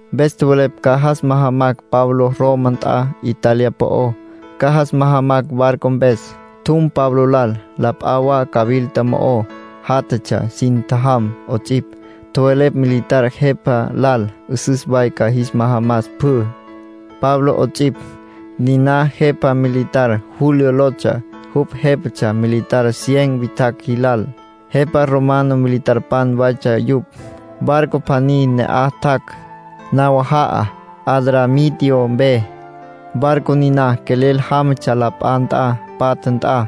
Mpes tjowelepj ca jas majamacj Pablo Roma nt'a Italia po'ó. Ca jas majamacj barco mpes. Tjum Pablo lal. La p'a wa cawilta mo'o játjatsja sin tjajam 'ots'ipj. Tjowelepj militar jepa lal 'üsüs way ca jis majamas pjü, Pablo 'ots'ipj. Niná jepa militar Julio lotsja. Jupj jépatsja militar cien witjacj jilal. Jepa romano militarpan waytsja yupj. Barco pjaní ne'aj tjac', nawaja'a Adramitio mpe. Barco niná quelel jámatsja la p'a nt'a patja nt'a,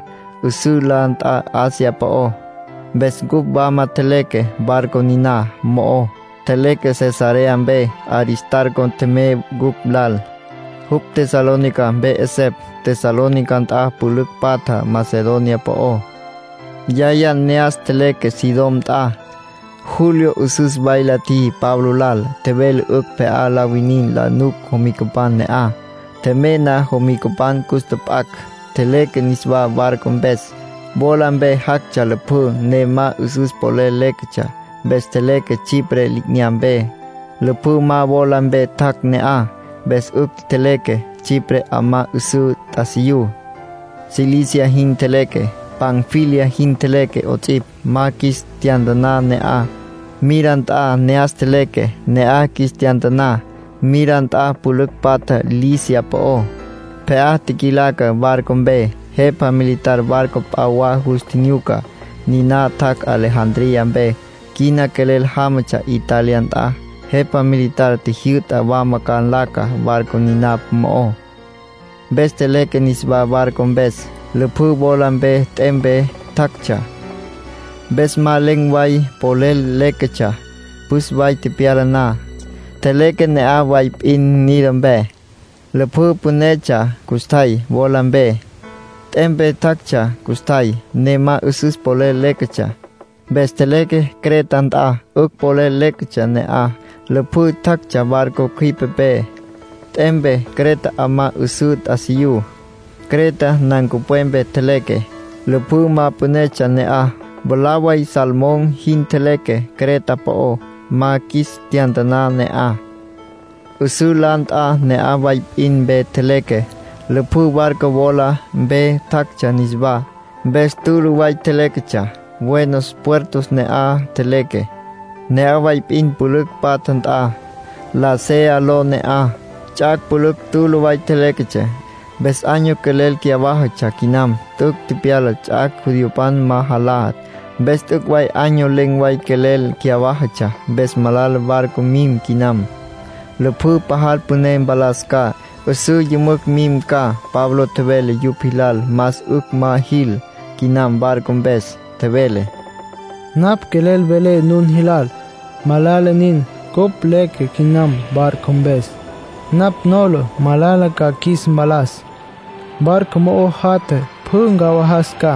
'üsǘ la nt'a Asia po'ó. Mpes cupj wama tjeleque barco niná mo'ó, tjeleque Cesarea mpe. Aristarco tjemey cupj lal. Jupj Tesalónica mpe 'esepj, Tesalónica nt'a pülücj patja Macedonia po'ó. Yaya ne'as tjeleque Sidón nt'a. Julio 'üsüs way la tjiji Pablo lal. Tjevele 'ücj pje'á la winin la nuc jomicapan ne'aj. Tjemey na jomicapan cus tjap'acj. Tjeleque niswá barco mpes. Wola mpe jactsja lüpjǘ, ne ma 'üsüs polel léquetsja. Mpes tjeleque Chipre li'inyampe. Lüpjǘ ma wola mpe tjac' ne'aj, mpes 'ücj tjeleque. Chipre 'amá 'üsǘ t'asiyú. Cilicia jin tjeleque, Panfilia jin tjeleque 'ots'ipj. Ma qjuis tyantaná ne'aj. Mira nt'a ne'as tjeleque, ne'aj qjuis tyantaná. Mira nt'a pülücj patja Licia po'ó. Pje'á tjiquilaca barco mpe. Jepa militar barco p'a wa jus tjinyuca. Niná tjac' Alejandría mpe. Quina quelel jámatsja Italia nt'a. Jepa militar tjijyü'ta wama ca nlaca barco niná mo'ó. Mpes tjeleque niswá barco mpes. Lüpjǘ wola mpe, t'em mpe tjactsja, mpes ma len̈ way polel léquetsja. Püs way tepyala na, tjeleque ne'aj way p'in Gnido mpe. Lüpjǘ pünetsja custjay, wola mpe, t'em mpe jactsja custjay, ne ma 'üsüs polel léquetsja. Mpes tjeleque Creta nt'a. 'Ücj polel léquetsja ne'aj; lüpjǘ tjactsja barco cjüipepé, t'em mpe. Creta 'amá 'üsǘ t'asiyú. Creta nancupwepe tjeleque. Lüpjǘ ma pünetsja ne'aj. Mwalá way Salmón jin tjeleque Creta po'ó, ma qjuis tyantaná ne'aj. 'Üsǘ la nt'a ne'aj way p'in mpe tjeleque. Lüpjǘ barco wola mpe tjactsja niswá, mpes tülü way tjeléquetsja. Buenos Puertos ne'as tjeleque. Ne'aj way p'in pülücj patja nt'a, Lasea ló ne'aj. Ts'ac' pülücj tülü way tjeléquetsja. Mpes año quelel cyawájatsja quinam. T'üc' tepyala ts'ac' judiopan ma jalá. Mpes t'üc' way año len̈ way quelel cyawájatsja. Mpes malala barco mim quinam; lüpjǘ pajal püné mpalas ca, 'üsǘ yümücj mim ca. Pablo tjevele yupj jilal más 'ücj ma jil quinam barco mpes. Tjevele: “Napj quelel velé nun jilal. Malala nin cupj leque quinam barco mpes. Napj nola malala ca qjuis mpalas. Barco mo'o jatja pjü ncawajas ca.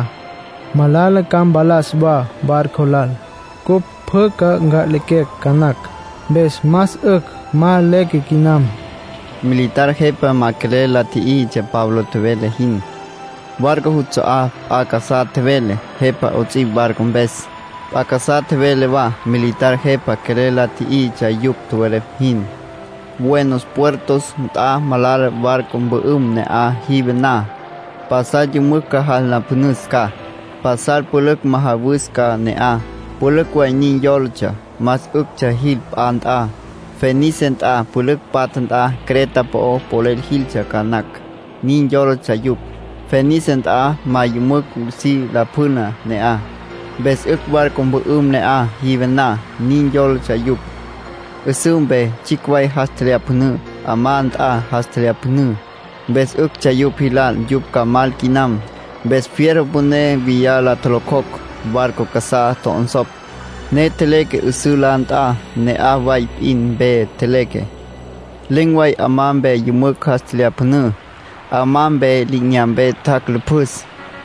Malala ca mpalas wa barco lal. Cupj pjü ca nca'lequecj ca nacj. Mpes más 'ücj ma leque quinam”, tjevele Pablo. Militar jepa ma quelel la tjíjitsja Pablo tjevele jin. Barco juts'a'á p'a casá tjevele, jepa 'ots'ipj barco mpes, p'a casá tjevele wa. Militar jepa quelel la tjíjitsja yupj tjowelepj jin. Buenos Puertos nt'a malala barco mpü'üm ne'aj jive na. Pasal yümücj jas nlapjünüs ca, pasal pülücj majawus ca ne'aj. Pülücj way nin yólatsja más 'üctsja jil p'a nt'a. Fenice nt'a pülücj patja nt'a Creta po'o polel jiltsja ca nacj, nin yólatsja yupj. Fenice nt'a ma yümücj si lapjüna ne'aj. Mpes 'ücj barco mpü'üm ne'aj jive na. Nin yólatsja yupj. 'Üsǘ mpe tsjicj way jas tjelyapjünǘ. 'Amá nt'a jas tjelyapjünǘ. Mpes 'üctsja yupj jilal yupj ca mal quinam. Mpes fierro püné viyá la tjolocjocj, barco casá tjo'onsopj, ne tjeleque. 'Üsǘ la nt'a ne'aj way p'in mpe tjeleque. Len̈ way 'amá mpe yümücj jas tjelyapjünǘ. 'Amá mpe li'inyampé tjac' lüpjüs.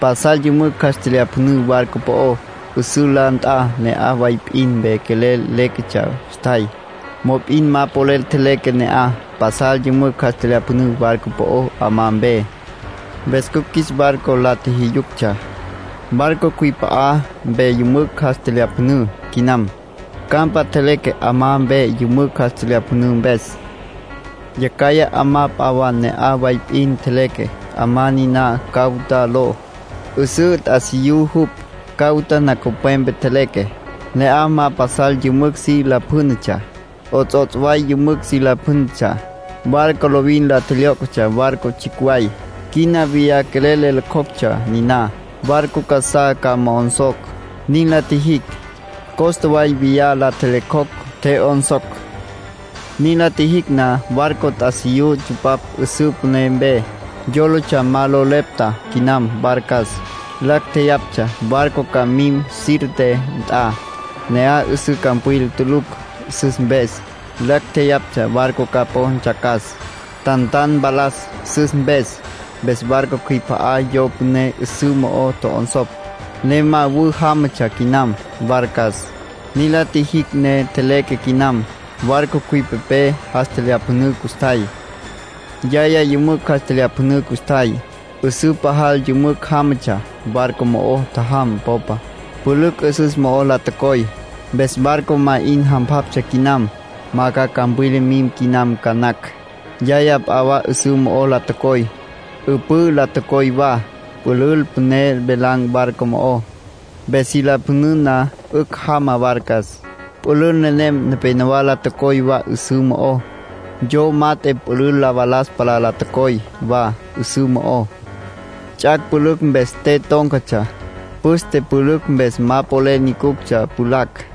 Pasal yümücj jas tjelyapjünǘ barco po'ó. 'Üsǘ la nt'a ne'aj way p'in mpe quelel léquetsja custjay, mop'in ma polel tjeleque ne'aj. Pasal yümücj jas tjelyapjünǘ barco po'ó 'amá mpe. Mpes cupj qjuis barco la tjijyu'yuctsja, barco cjüip'a'a mpe yümücj jas tjelyapjünǘ quinam. Campa tjeleque 'amá mpe yümücj jas tjelyapjünǘ mpes. Yacjaya 'amá p'a wa ne'aj way p'in tjeleque. 'Amá niná Cauda ló. 'Üsǘ t'asiyú jupj. Cauda nancupwepe tjeleque. Ne'aj ma pasal yümücj si lapjǘnatsja, 'ots'ots' way yümücj si lapjǘnatsja. Barco lovin la tjelyó'cjatsja barco tsjicj way. Quina viyá quelel le locjoctsja niná, barco casá ca mo'onsocj. Nin la tjijicj. Costa way viyá la tjelyo'cjocj, tje'yonsocj. Nin la tjijicj na, barco t'asiyú tsupapj 'üpǘ püné mpes. Yólatsja ma lo lepta quinam barcas. Lacj tjeyaptsja barco ca mim Sirte nt'a. Ne'aj 'üsǘ campwila tulucj sus mpes. Lacj tjeyaptsja barco ca po ntsjacas, tantan mpalas sus mpes. Mpes barco cjüip'a'a yo püné 'üsǘ mo'o tjo'onsopj, ne ma wü jámatsja quinam, barcas. Nin la tjijicj ne tjeleque quinam; barco cjüipepé jas tjelyapjünǘ custjay. Yaya yümücj jas tjelyapjünǘ custjay, 'üsǘ pajal yümücj jámatsja. Barco mo'o tjajam popa, pülücj 'üsüs mo'o la tocoy. Mpes barco más 'in jampjaptsja quinam, ma ca campwila mim quinam ca nacj. Yaya p'a wa 'üsǘ mo'o la tocoy. 'Üpǘ la tocoy wa. Pülül püné velan̈ barco mo'ó, mpes si lapjüna na, 'ücj jama barcas. Pülül nenem nepenowá la tocoy wa 'üsǘ mo'ó. Yo mat'e pülül la valas palá la tocoy wa 'üsǘ mo'ó. Ts'ac' pülücj mpes te tón̈catsja. Püste pülücj mpes ma polel nyucuctsja pjulacj.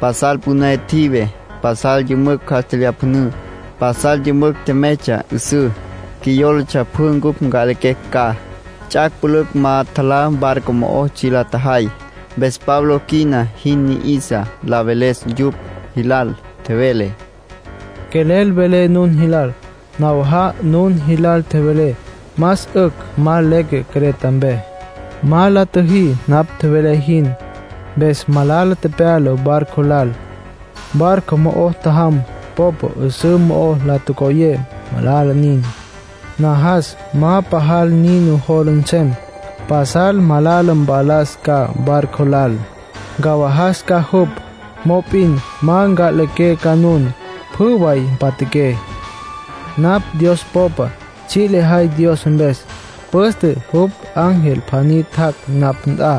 Pasal püné tjive. Pasal yümücj jas tjelyapjünǘ. Pasal yümücj tjemeytsja 'üsǘ. Qjuiyólatsja pjü cupj nca'lequecj ca. Ts'ac' pülücj ma tjalá barco mo'o tsji' la tjajay. Mpes Pablo quina jin ni'isa la veles yupj jilal. Tjevele: “Quelel velé nun jilal. Nawaja'a nun jilal tjevelé más 'ücj ma leque Creta mpe. Ma la tjüjí napj tjevelé jin. Mpes malala tepyala barco lal. Barco mo'o tjajam popa 'üsǘ mo'o la tocoyé. Malala nin. Najas ma pajal nin nujola nsem. Pasal malala mpalas ca barco lal. Ncawajas ca jupj. Mop'in ma nca'liqué ca nun. Pjü way mpatjaqué. Napj Dios popa. Tsji' lejay Dios mpes. Püste jupj ángel pjaní tjac' napj nt'a,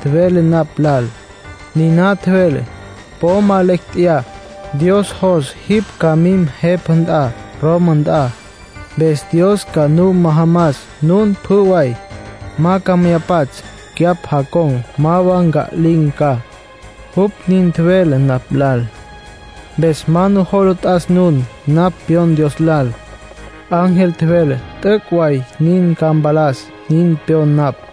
tjevele napj lal. Niná tjevele: ‘Po ma lecj tjeyá. Dios jos jipj ca mim jepa nt'a Roma nt'a. Mpes Dios ca nu majamas nun pjü way. Ma ca mya pats'; cyapj jacon̈ ma wa nca'lin̈ ca’, jupj nin tjevele napj lal. Mpes ma nujola t'as nun. Napj pyon Dios lal. Ángel tjevele, t'üc' way nin ca mpalas, nin pyon napj.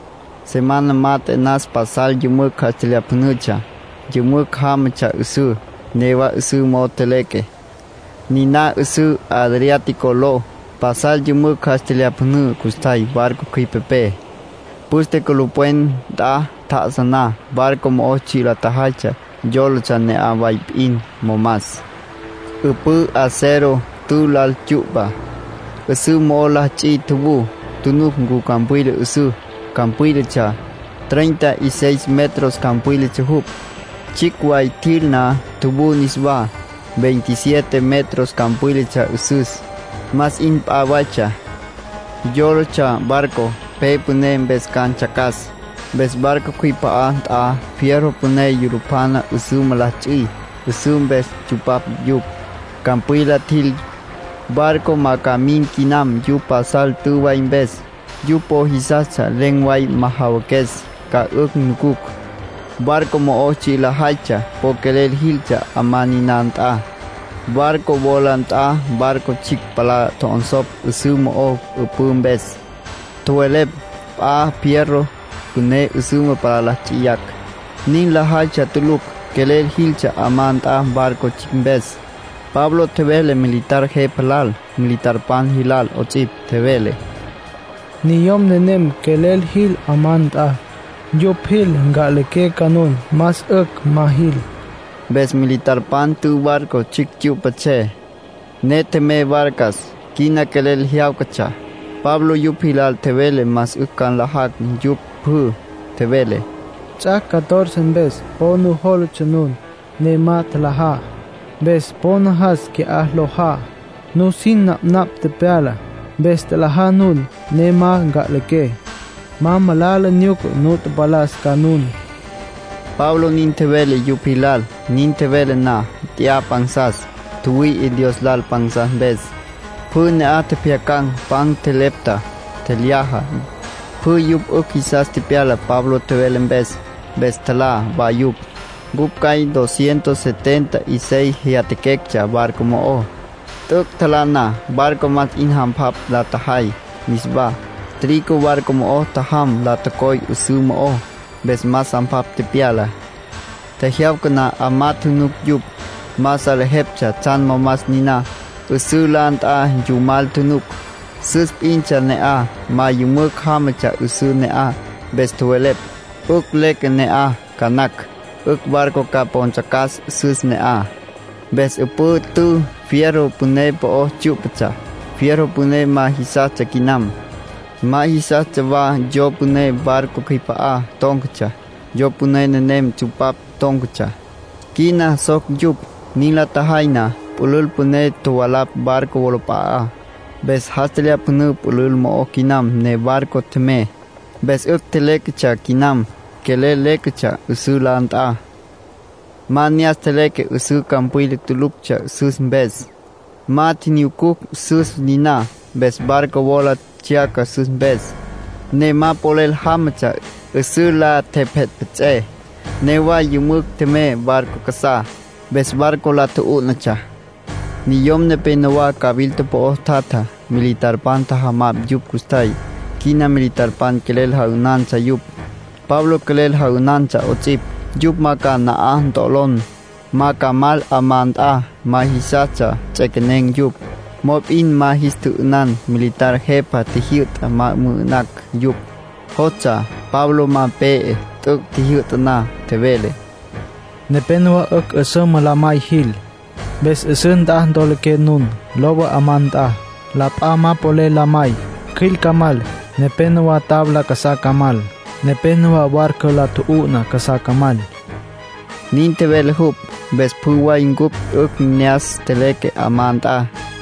Semana mat'e nas pasal yümücj jas tjelyapjünütsja, yümücj jámatsja 'üsǘ. Newa 'üsǘ mo'o tjeleque, niná 'üsǘ Adriático ló. Pasal yümücj jas tjelyapjünǘ custjay barco cjüipepé. Püste culupwen nt'a tjá'asa na, barco mo'o tsji' lajaytsja yólatsja ne'aj way p'in momas. 'Üpǘ, acero tü lal tsyu'pa, 'üsǘ mo'o la ts'i tjuvú, tjunuc ncu campwila 'üsǘ. Campwílatsja, treinta y seis metros campwílatsja jupj. Tsjicj way tjil na, tjuvú niswá. Veintisiete metros campwílatsja 'üsüs. Más 'in pja waytsja. Yólatsja barco pe püné mpes ca ntsjacas. Mpes barco cjüip'a'a nt'a fierro püné yulupjana 'üsüma la ts'i, 'üpǘ mpes tsupapj yupj. Campwila tjil, barco ma ca mim quinam yupj pajal tü way mpes. Yupj po jisastsja len̈ way majawaques, ca 'ücj nucucj. Barco mo'o tsji' lajaytsja po quelel jiltsja 'amá niná nt'a. Barco wola nt'a barco tsjicj palá tjo'onsopj 'üsǘ mo'ó 'üpǘ mpes. Tjowelepj p'a fierro püné 'üsüma palá nts'iyacj. Nin lajaytsja tulucj. Quelel jiltsja 'amá nt'a barco tsjicj mpes. Pablo tjevele militar jepa lal, militarpan jilal 'ots'ipj. Tjevele: “Niyom nenem quelel jil 'amá nt'a. Yupj jil, nca'liqué ca nun. Más 'ücj ma jil.” Mpes militarpan t'ü barco tsjicj tsyu'patsjé, ne tjemey barcas. Quina quelel jyáwcatsja. Pablo yupj jilal tjevele más 'ücj ca nlajacj yupj pjü. Tjevele: “Ts'ac' catorce mpes po nujólatsja nun, ne ma tjalajá. Mpes po najas quina lojá. Nusin napnapj tepyala. Mpes tjalajá nun, ne ma nca'liqué. Ma malala nyuca nu mpalas ca nun”, Pablo nin tjevele yupj jilal. Nin tjevele na, nt'ya pansas. Tjüwüi'i Dios lal pansas mpes, pjü ne'aj tjepjyacan̈. Pan tjelepta, tjelyaja. Pjü yupj 'ücj jisas tepyala Pablo tjevele mpes. Mpes tjalá wa yupj. Cupj cjay dos cientos setenta y seis jyatjaquectsja barco mo'ó. T'üc' tjalá na, barco más 'in jampjapj la tjajay niswá. Trigo barco mo'o tjajam la tocoy 'üsǘ mo'ó, mpes más jampjapj tepyala. Tjejyawca na 'amá tjunuc yupj. Ma salejeptsja tsjan momas niná. 'Üsǘ la nt'a yumal tjunuc, sus p'intsja ne'aj, ma yümücj jámatsja 'üsǘ ne'aj. Mpes tjowelepj: “'Ücj leque ne'aj ca nacj, 'ücj barco ca po ntsjacas sus ne'aj.” Mpes 'üpǘ t'ü fierro püné po'o tsyú'patsja. Fierro püné ma jisastsja quinam. Ma jisastsja wa yo püné barco cjüip'a'a tón̈catsja. Yo püné nenem tsupapj tón̈catsja, quina soc yupj. Nin la tjajay na, pülül püné tjovalapj barco wolap'a'á, mpes jas tjelyapjünǘ pülül mo'ó quinam ne barco tjemey. Mpes 'ücj tjeléquetsja quinam, quelel léquetsja 'üsǘ la nt'a. Ma ne'as tjeleque. 'Üsǘ campwila tuluctsja sus mpes. Ma tjinyucucj sus niná. Mpes barco wola tsjyaca sus mpes, ne ma polel jámatsja. 'Üsǘ la tjepjetpjets'é, newa yümücj tjemey barco casá, mpes barco la tju'ú'natsja. Niyom nepénowa cawilta po'o tjatja, militarpan tjajamaptsja yupj custjay. Quina militarpan quelel ja'ünantsja yupj, Pablo quelel ja'ünantsja 'ots'ipj, yupj ma ca na'aj ntolon̈, ma ca mal 'amá nt'a. Ma jisastsja nts'equenen̈ yupj. Mop'in ma jis tjü'ünan. Militar jepa tjijyü'ta ma mü'ü'nacj yupj. Jostsja Pablo ma pe'e. T'üc' tjijyü'ta na, tjevele: “Nepénowa 'ücj 'üsüma la may jil. Mpes 'üsǘ nt'a ntoloqué nun, lowa 'amá nt'a. La p'a ma polel la may, cjüil ca mal, nepénowa tabla casá ca mal, nepénowa barco la tju'u'na casá ca mal”, nin tjevele jupj. Mpes pjü way cupj 'ücj ne'as tjeleque 'amá nt'a.